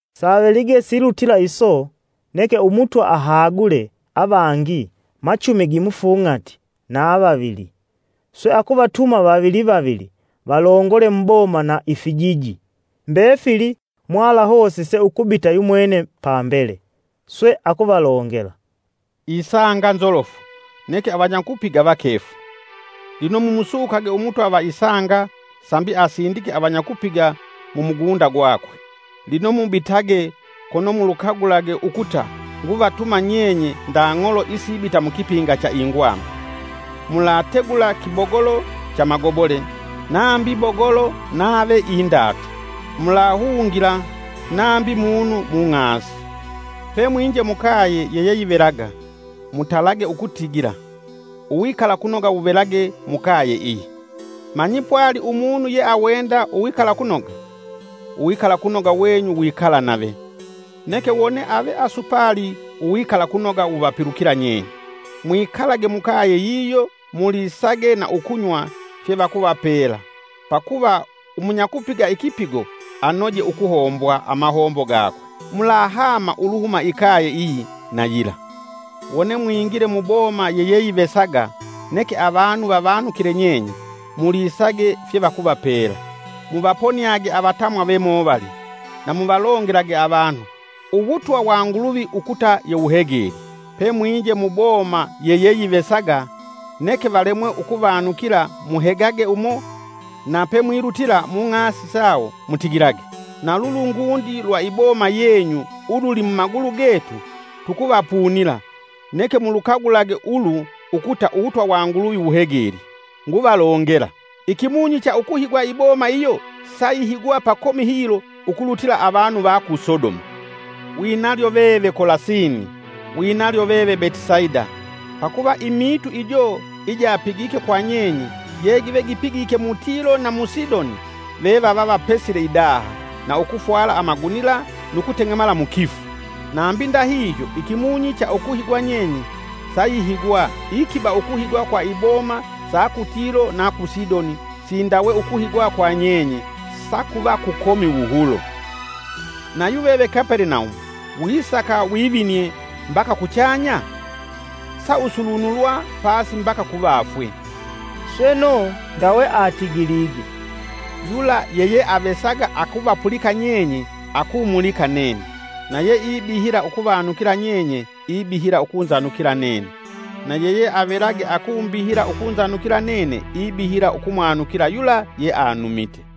Savelige silutila iso, neke Umutwa ahagule avangi machumi gimufung'ati na vavili, swe akuvatuma vavili vavili valongole muboma na ifijiji mbefili mwalahosise ukubita yumwene pambele. Swe akuvalongela, “Isanga nzolofu, neke avanyakupiga vakefu; lino mumusukage Umutwa va isanga sambi asindike avanyakupiga mu mugunda gwakwe. Lino mubitage kono mulukagulage ukuta nguvatuma nyenye nda ng'olo isibita mukipinga cha ingwami. Mulategula kibogolo cha magobole, nambi bogolo nave indatu, mulahungila nambi munu mung'asi. Pe mwinje mukaye yeyeyivelaga, mutalage ukutigila, ‘Uwikalakunoga wuvelage mukaye iyi!’ Manyi pwali umunu yeawenda uwikalakunoga, uwikalakunoga wenyu wikala nave, neke wone ave asupali uwikalakunoga wuvapilukila nyenye. Mwikalage mukaye yiyo mulisage na ukunywa fyevakuvapela, pakuva umunyakupiga ikipigo anoje ukuhombwa amahombo gakwe, mulahama uluhuma ikaye iyi na yila. Wone mwingile mu boma yeyeyivesaga neke avanu vavanukile nyenye, mulisage fye vakuvapela. Muvaponiage avatamwa vemovali, na muvalongelage avanu, ‘Uwutwa wa Nguluvi ukuta yewuhegelye.’ Pemwinje muboma yeyeyivesaga neke valemwe ukuvanukila muhegage umo na pemwilutila mung'asi sawo mutigilage: ‘Nalulungundi lwa iboma yenyu ululi mumagulu getu tukuvapunila; neke mulukagulage ulu ukuta uwutwa wa Nguluvi wuhegelye.’ Nguvalongela, ikimunyi cha ukuhigwa iboma iyo sayihigwa pakomi hilo ukulutila avanu va ku Sodoma! “Winalyo veve, Kolasini! Winalyo veve Betisaida! Pakuva imiitu ijo ijapigike kwa nyenye je give gipigike mu Tilo na mu Sidoni, ve vava pesile idaha, na ukufwala amagunila nu kuteng'emala mukifu. Nambi ndahihyo, ikimunyi cha ukuhigwa nyenye sayihigwa ikiba ukuhigwa kwa iboma sa ku Tilo na ku Sidoni sindawe ukuhigwa kwa nyenye sakuva kukomi wuhulo. Nayuveve Kapelenaumu wisaka wivinie mbaka kuchanya? Sausulunulwa pasi mbaka kuvafwe!.” Sweno ndawe atigilige yakuvapulikisa nyenye akumulikisa nene, “Yula yeyeavesaga akuvapulika nyenye akumulika nene, na yeakubihila ukuvanukila nyenye, ibihila ukunzanukila nene. Na yeyeavelage akumbihila ukunzanukila nene ibihila ukumwanukila yula yeanumite.”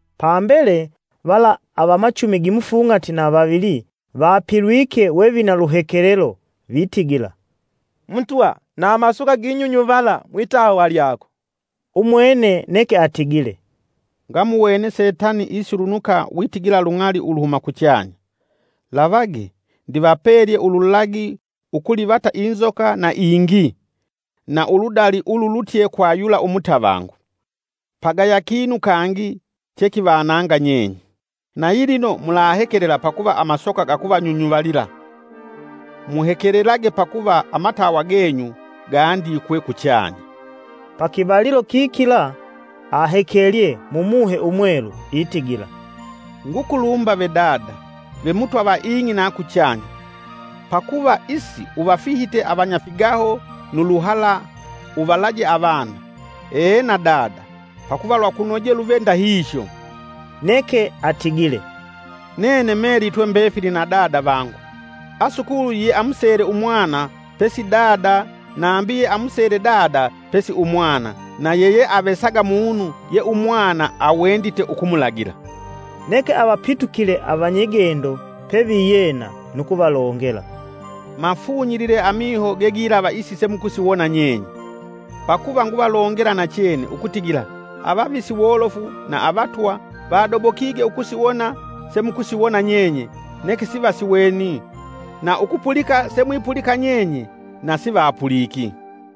Pambele vala avamachumi gimufung'ati na vavili vapilwike we vina luhekelelo vitigila, “Mutwa, na amasoka ginyunyuvala mwitawa lyako.” Umwene neke atigile, “Ngamuwene Setani isulunuka witigila lung'ali uluhuma kuchanya. Lavage, ndivapelye ululagi ukulivata inzoka na ingii, na uludali ululutye kwa yula umutavangu, pagaya kinu kangi chekivananga nyenye. Nayilino mulahekelela pakuva amasoka gakuvanyunyuvalila, muhekelelage pakuva amatawa genyu gandikwe kuchanya.” Pakivalilo kikila ahekelye mu Muhe Umwelu itigila, “Ngukulumba ve Dada, ve Mutwa va ing'i na kuchanya, pakuva isi uvafihite avanyafigaho nu luhala uvalaje avana. Ena, Dada, pakuva lwakunoje luve ndahihyo.” Neke atigile, “Nene melitwe mbefili na Dada vangu. Asukuli yeamusele Umwana pesi Dada nambi yeamusele Dada pesi Umwana na yeyeavesaga munu ye umwana awendite ukumulagila.” Neke avapitukile avanyigendo peviyena nu kuvalongela, “Mafunyilile amiho gegilava isi semukusiwona nyenye! Pakuva nguvalongela nachene ukutigila avavisi wolofu na avatwa vadobokige ukusiwona semukusiwona nyenye neke sivasiweni, na ukupulika semwipulika nyenye na sivapuliki.”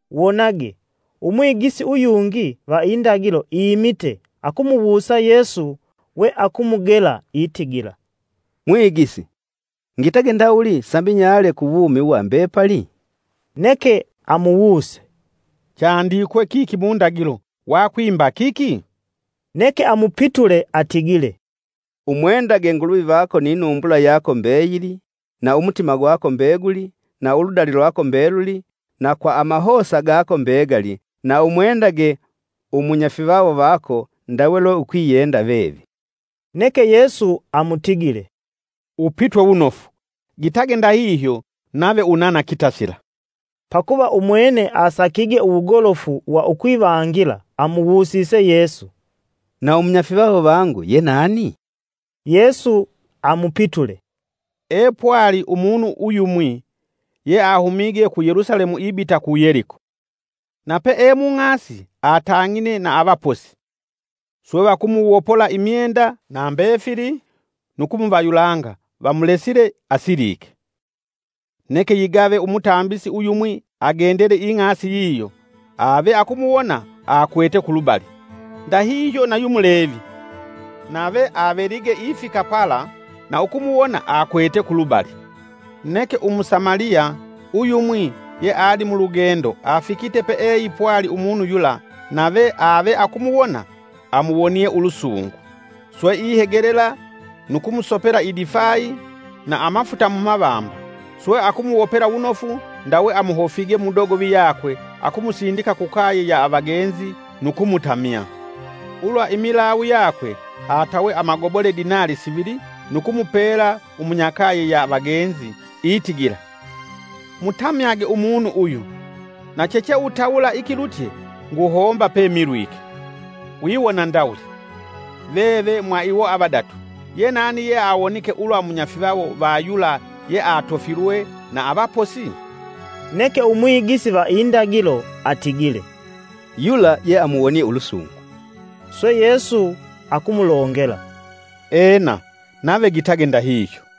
Wonage, umwigisi uyungi va indagilo iimite akumuwusa Yesu we akumugela, itigila, “Mwigisi, ngitage ndawuli sambi nyale ku wumi wa mbepali?” Neke amuwuse, “Chandikwe kiki mundagilo wakwimba kiki?” Neke amupitule atigile, “Umwendage Nguluvi vako ni numbula yako mbeyili, na umutima gwako mbeguli, na uludali lwako mbeluli, na kwa amahosa gako mbegali, na umwendage umunyafivawo vako ndawe lwe ukwiyenda veve.” Neke Yesu amutigile, “Upitwe wunofu! Gitage ndahihyo nave unana kitasila.” Pakuva umwene asakige uwugolofu wa ukwivangila amuwusise Yesu, “Na umunyafivawo vangu ye nani?” Yesu amupitule, “Epwali umunu uyumwi yeahumige ku Yelusalemu ibita ku Yeliko. Na pe e mung'asi atang'ine na avaposi, swe vakumuwopola imyenda na mbefili nu kumuvayulanga vamulesile asilike. Neke yigave umutambisi uyumwi agendele ing'asi yiyo ave akumuwona akwete kulubali. Ndahihyo nayu mulevi, nave avelige ifika pala na ukumuwona akwete kulubali. Neke Umusamaliya, uyumwi yealimulugendo afikite peeipwali umunu yula nave ave akumuwona, amuwonie ulusungu, swe ihegelela nu kumusopela idifayi na amafuta mumavamba swe, akumuwopela wunofu ndawe amuhofige mu dogovi yakwe akumusindika kukaye ya avagenzi nu kumutamya. Ulwa imilawu yakwe atawe amagobole dinali sivili nu kumupela umunyakaye ya vagenzi itigila, ‘Mutamyage umunu uyu; na chicheutawula ikilutye nguhomba pemilwike.’” Wiwona ndawuli, “Veve mwa iwo avadatu, Yenani yeawonike ulwa munyafivawo va yula yeatofilwe na avaposi?” Neke umwigisi va indagilo atigile, “Yula yeamuwonie ulusungu.”, swe Yesu akumulongela, “Ena, nave gitage ndahihyo.”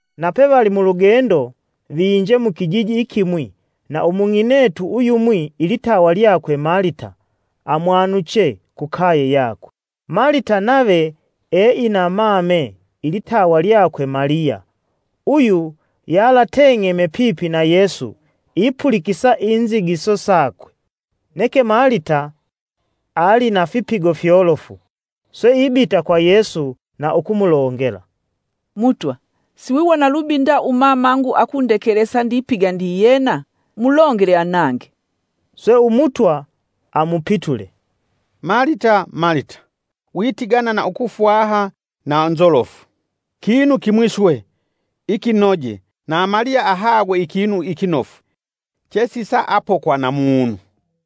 Na pevali mulugendo viinje mukijiji ikimwi, na umung'inetu uyumwi ilitawa lyakwe Malita amwanuche kukaye yakwe. Malita nave eina mame ilitawa lyakwe Maliya; uyu yalateng'eme pipi na Yesu ipulikisa inzigiso sakwe. Neke Malita ali na fipigo fyolofu; swe ibita kwa Yesu na ukumulongela, “Mutwa, siwiwona lubi nda umamangu akundekelesa ndipiga ndiyena? Mulongele anange.” Swe Umutwa amupitule, “Malita, Malita, witigana na ukufwaha na nzolofu. Kinu kimwi swe, ikinoje na Maliya ahagwe ikinu ikinofu, chesisaapokwa na munu.”